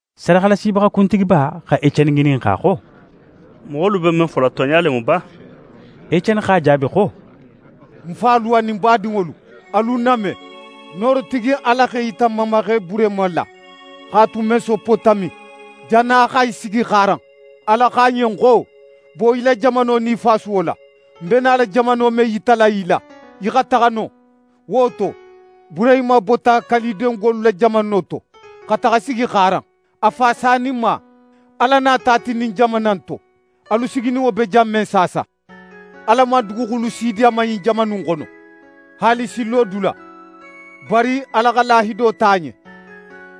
Sadaxalasibaxa kuntigiba xa Eceni ŋininxa xo: «Moxolu be men fola, tonɲa le mu ba?» Eceni x'a jaabi xo: «Ń falu anin ń badinŋolu, alu ń name! Noorotigi Ala x'é yita n mamaxe Burehima la, x'a tu Mesopotami, jannin a xa sigi Xaaran. Ala xo a ɲen xo: “Bo í la jamano nin í fasuwo la, ń be nala jamano men yitala í la, í xa taxa non.” Wo to, Burehima bota Kalidengolu la jamano to, xa taxa sigi Xaaran. A fa saninma, Ala nata a ti ɲin jamana in to, alu sigininŋo be jan men saasa. Ala man duguxulu si di a ma ɲin jamana in xono, haali sin lodula. Bari Ala xa lahido ta a ɲen,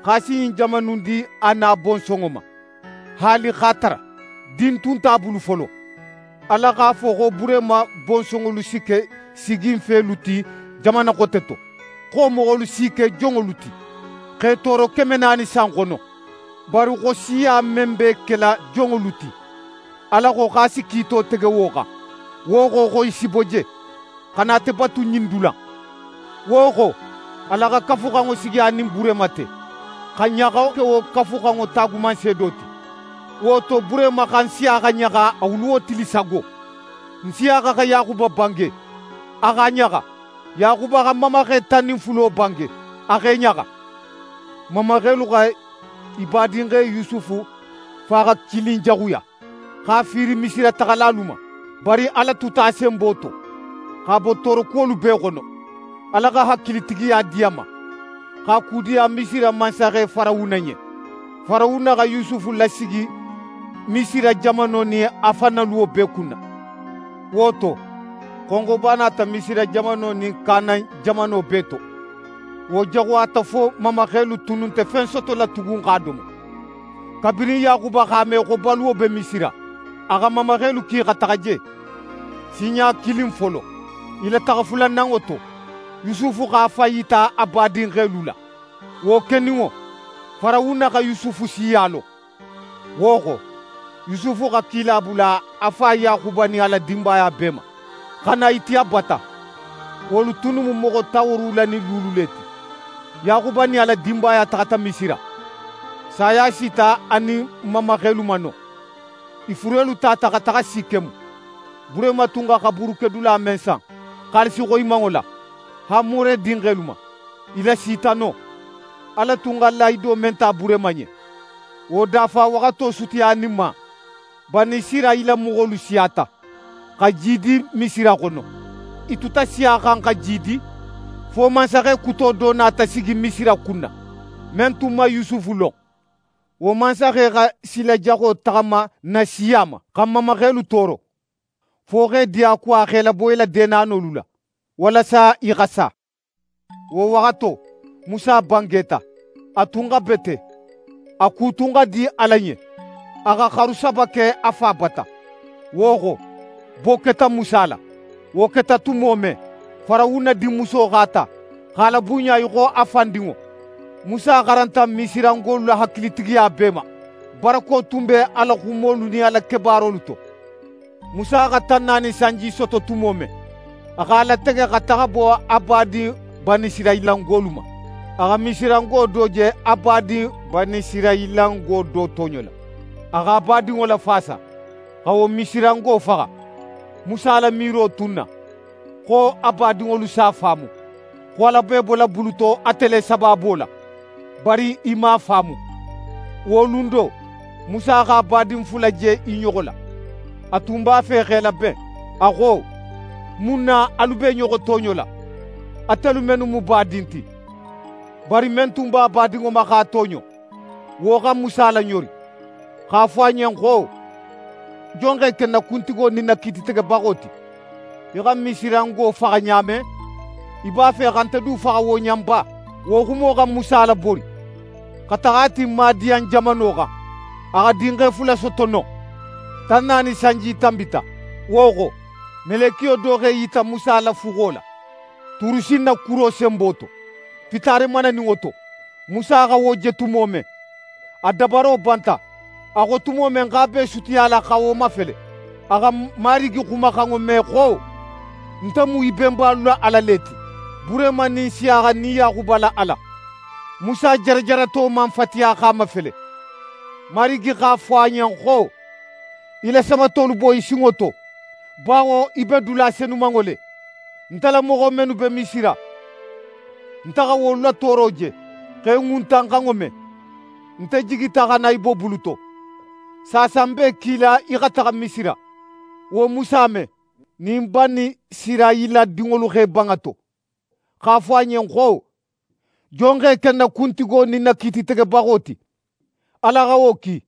xo a si ɲin jamana in di a nin a bonsonŋo ma, haali x'a tara din tun nte a bulu folo. Ala x'a fo xo Burehima bonsonŋolu si ke siginfelu ti jamana xote to, xo wo moxolu s'i ke jonŋolu ti, x'e tooro keme naani san xono. Bari xo siya men b'e kela jonŋolu ti, Ala xo, a si kiito tege wo xan. Wo xo, xo i si bo je, xa na ate batu ɲin dula in. Wo xo, Ala xa Kafuxanŋo sigi a nin Burehima te, xa ɲaxo ke wo Kafuxanŋo taagumanseedo ti. Wo to, Burehima xa Nsiyaxa ɲaxa a wuluwo tili sago. Nsiyaxa xa Yaxuba bange, a x'a ɲaxa, Yaxuba xa n mamaxe tan nin fulo bange, a x'e ɲaxa. «N mamaxelu xa i badinxe Yusufu faxakilinjaxuya, x'a fiiri Misira taxalalu ma. Bari Ala tuta a senbo to, x'a bo toorokuwolu bee xono. Ala xa hakilitigiya di a ma, x'a kudiya Misira mansaxe Farawuna ɲen. Farawuna xa Yusufu lasigi Misira jamano nin a fan na luwo bee kunna. Wo to, xonxoba nata Misira jamano nin Kanan jamano bee to. Wo jaxuyata fo n mamaxelu tunnu nte fen sotola tugun x'a domo. Kabirin Yaxuba x'a me xo baluwo be Misira, a xa n mamaxelu ki xa taxa je sinɲa kilin folo. I la taxa fulananŋo to, Yusufu x'a fan yita a badinxelu la. Wo keninŋo, Farawuna xa Yusufu siya lon. Wo xo, Yusufu xa kila bula a fa Yaxuba nin a la dinbaya bee ma, xa na i ti a bata. Wolu tunnu mu moxo tan woorowula nin luulu le ti. Yaxuba nin a la dinbaya taxata Misira. Saya sita a nin n mamaxelu ma non. I furelu tata xa taxa Sikemu. Burehima tun xa xaburukedula men san xaalisi xoyimanŋo la, Hamore dinxelu ma, i lasita non. «Ala tun xa lahido men ta Burehima ɲen, wo dafawaxato sutiyaninma, Banisirayila moxolu siyata, xa jiidi Misira xono. I tuta siyaxan, xa jiidi, fo mansaxe kuto do nata sigi Misira kunna, men tun man Yusufu lon. Wo mansaxe xa sila jaxo taxama n na siya ma, xa n mamaxelu tooro, fo x'e diyakuwa x'e labo i la deenanolu la, walasa i xa sa. Wo waxato, Musa bangeta. A tun xa bete; a ku tun xa di Ala ɲen. A xa xaru saba ke a fa bata. Wo xo, bo keta Musa la. Wo keta tumo men, Farawuna dinmuso x'a ta, x'a labunɲa í xo a fan dinŋo. Musa xaranta Misirangolu la hakilitigiya bee ma. Barako tun be a la xumolu nin a la kebaarolu to. Musa xa tan naani sanji soto tumo men, a x'a latege xa taxa bo a badin Banisirayilangolu ma. A xa Misirango do je a badin Banisirayilango do tooɲola. A x'a badinŋo lafaasa, xa wo Misirango faxa. Musa la miiro tun na, xo a badinŋolu s'a faamu, xo Ala be i bola bulu to ate le sabaabo la. Bari i man a faamu. Wo lun do, Musa x'a badin fula je i ɲoxo la. A tun b'a fe x'e laben. A xo: “Mun na alu be i ɲoxo tooɲola, atelu mennu mu badin ti?” Bari men tun b'a badinŋo ma x'a tooɲo, wo xa Musa laɲori, x'a fo a ɲen xo: “Jon x'é ke n na kuntigo nin n na kiititegebaxo ti? Í xa Misirango faxa ɲa men, í b'a fe xa nte du faxa wo ɲa in ba?” Wo xumo xa Musa labori, xa taxa a ti Madiyan jamano xan. A xa dinxe fula soto non. «Tan naani sanji tanbita. Wo xo, melekiyo do x'é yita Musa la fuxo la, Turusinna kuro senbo to, fitaare mananinŋo to. Musa xa wo je tumo men, a dabaro banta. A xo tumo men xo a b'é sutiyala xa wo mafele, a xa Marigi xumaxanŋo me xo: “Nte mu í benbalu la Ala le ti, Burehima nin Nsiyaxa nin Yaxuba la Ala.” Musa jarajarato man fatiya x'a mafele. Marigi x'a fo a ɲen xo: “Í la samatolu bo í sinŋo to, bawo í be dula senumanŋo le. Nte la moxo mennu be Misira, nte xa wolu la tooro je, x'e ŋuntanxanŋo me. Nte jigita xa na i bo bulo to. Saasa ń b'é kila í xa taxa Misira.” «Wo Musa men nin Banisirayila dinŋolu x'e ban a to, x'a fo a ɲen xo: “Jon x'é ke n na kuntigo nin n na kiititegebaxo ti?”, Ala xa wo ki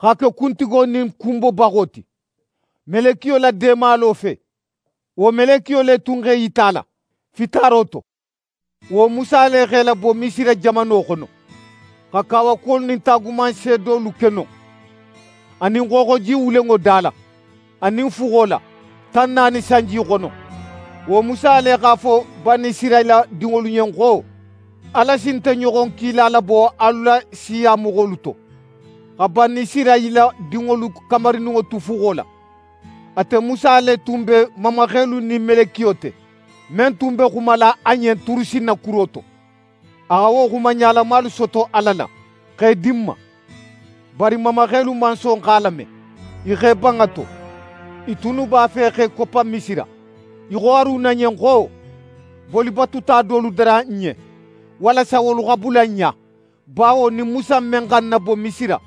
x'a ke kuntigo nin kunbobaxo ti, melekiyo la deemalo fe. Wo melekiyo le tun x'é yita a la, fitaaro to. Wo Musa le x'e labo Misira jamano xono, xa kawakuwolu nin taagumanseedolu ke non, anin Xooxoji Wulenŋo da la, anin fuxo la, tan naani sanji xono. Wo Musa le x'a fo Banisirayila dinŋolu ɲen xo: “Ala si nte ɲoxon kila labo alu la siya moxolu to.” Xa Banisirayila dinŋolu kamarininŋo tu fuxo la, ate Musa le tun be n mamaxelu nin melekiyo te, men tun be xumala a ɲen Turusinna kuro to. A xa wo xuma ɲalamalu soto Ala la, x'e di n ma. Bari n mamaxelu man son x'a lame. I x'e ban a to. I tunnu b'a fe x'e koppa Misira. I xo Haruna ɲen xo: “Bolibatuta dolu dara n ɲen, walasa wolu xa bula n ɲa, bawo ɲin Musa in men xa n nabo Misira,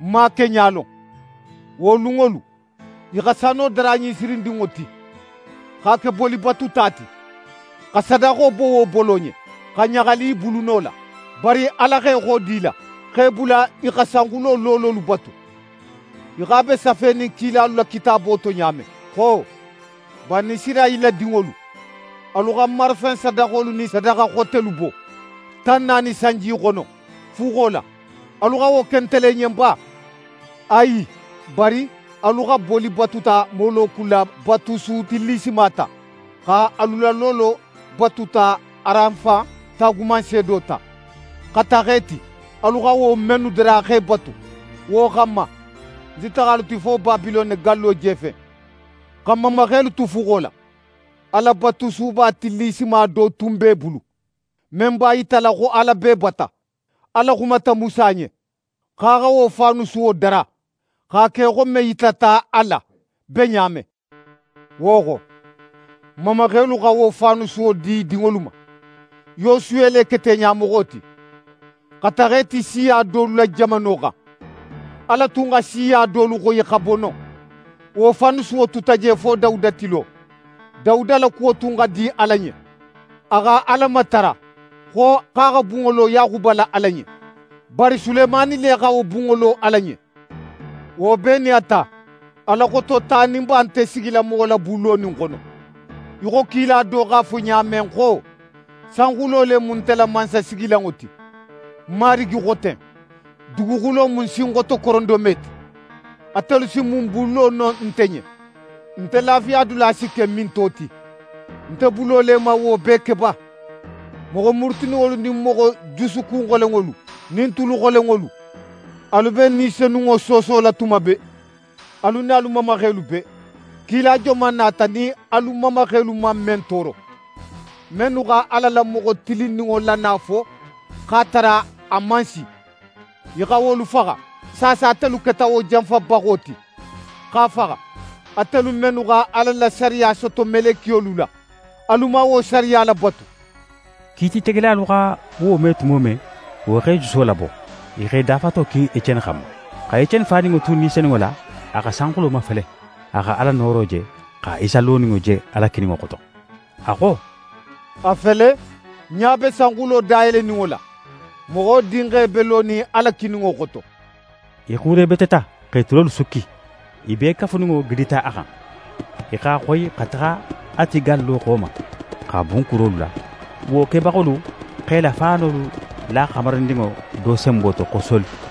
n man a keɲa lon.” Wo lunŋolu, i xa sano dara ɲinsirindinŋo ti, x'a ke bolibatuta ti, xa sadaxo bo wo bolo ɲen, xa ɲaxali i buluno la. Bari Ala x'é xodi i la, x'e bula i xa sanxulo loololu batu, í xo a be safenin kilalu la kitaabo to ɲa men xo: “Banisirayila dinŋolu, alu xa marafen sadaxolu nin sadaxa xotelu bo tan naani sanji xono, fuxo la, alu xa wo ke nte le ɲen ba? Ayi! Bari alu xa bolibatuta Moloku la batusu tillisima ta, xa alu la loolo batuta Ranfan taagumanseedo ta, xa taxa i ti, alu xa wo mennu dara x'e batu. Wo xanma, ń si taxa alu ti fo Babilone gallo jefen.” «Xa n mamaxelu tu fuxo la, Alabatusuba tillisima do tun be i bulu, men b'a yitala xo Ala b'e bata. Ala xumata Musa ɲen, xo a xa wo faanusuwo dara x'a ke í xo men yitata a la be ɲa men. Wo xo, n mamaxelu xa wo faanusuwo di i dinŋolu ma. Yosuwe le keta i ɲamoxo ti, xa taxa i ti siya dolu la jamano xan. Ala tun xa siya dolu xoyi xa bo non. Wo faanusuwo tuta je fo Dawuda tilo. Dawuda la kuwo tun xa di Ala ɲen, a xa Ala matara xo a xa bunŋo lo Yaxuba la Ala ɲen. Bari Sulemani le xa wo bunŋo lo Ala ɲen. Wo bee nin a ta, Ala Xototaninba nte sigila moxo la bun lonin xono, í xo kila do x'a fo ɲa men xo: “Sanxulo le mu nte la mansasigilanŋo ti. Ń Marigi xo ten. Duguxulo mu ń sinxoto korondome ti. Atelu si mun bun lo no nte ɲen? Nte lafiyadula si ke minto ti? Nte bulo le man wo bee ke ba?” «Moxo murutininŋolu nin moxo jusukun xolenŋolu nin tulu xolenŋolu! Alu be Ni Senunŋo soosola tuma bee, alu nin alu mamaxelu bee. Kila joman nata nin alu mamaxelu man men tooro? Mennu xa Ala la moxo Tilinninŋo la nalo fo x'a tara a man si, i xa wolu faxa. Saasa atelu keta wo janfabaxo ti, x'a faxa. Atelu mennu xa Ala la sariya soto melekiyolu la, alu man wo sariya labatu!» Kiititegelalu xa wo me tumo men, wo x'e juso labo, i x'e dafato kin Eceni xanma. Xa Eceni faninŋo tu Ni Senunŋo la, a xa sanxulo mafele. A xa Ala nooro je, xa Isa loninŋo je Ala kininŋo xoto. A xo: «A fele, ń ɲa be sanxulo dayeleninŋo la, Moxo Dinxe be lonin Ala kininŋo xoto.» I xuurebeteta, x'e tulolu sukki, i bee kafuninŋo gidita a xan. I x'a xoyi, xa taxa a ti gallo xo ma, x'a bun kurolu la. Wo kebaxolu x'e la faanolu la xamarindinŋo do senbo to xo Soli.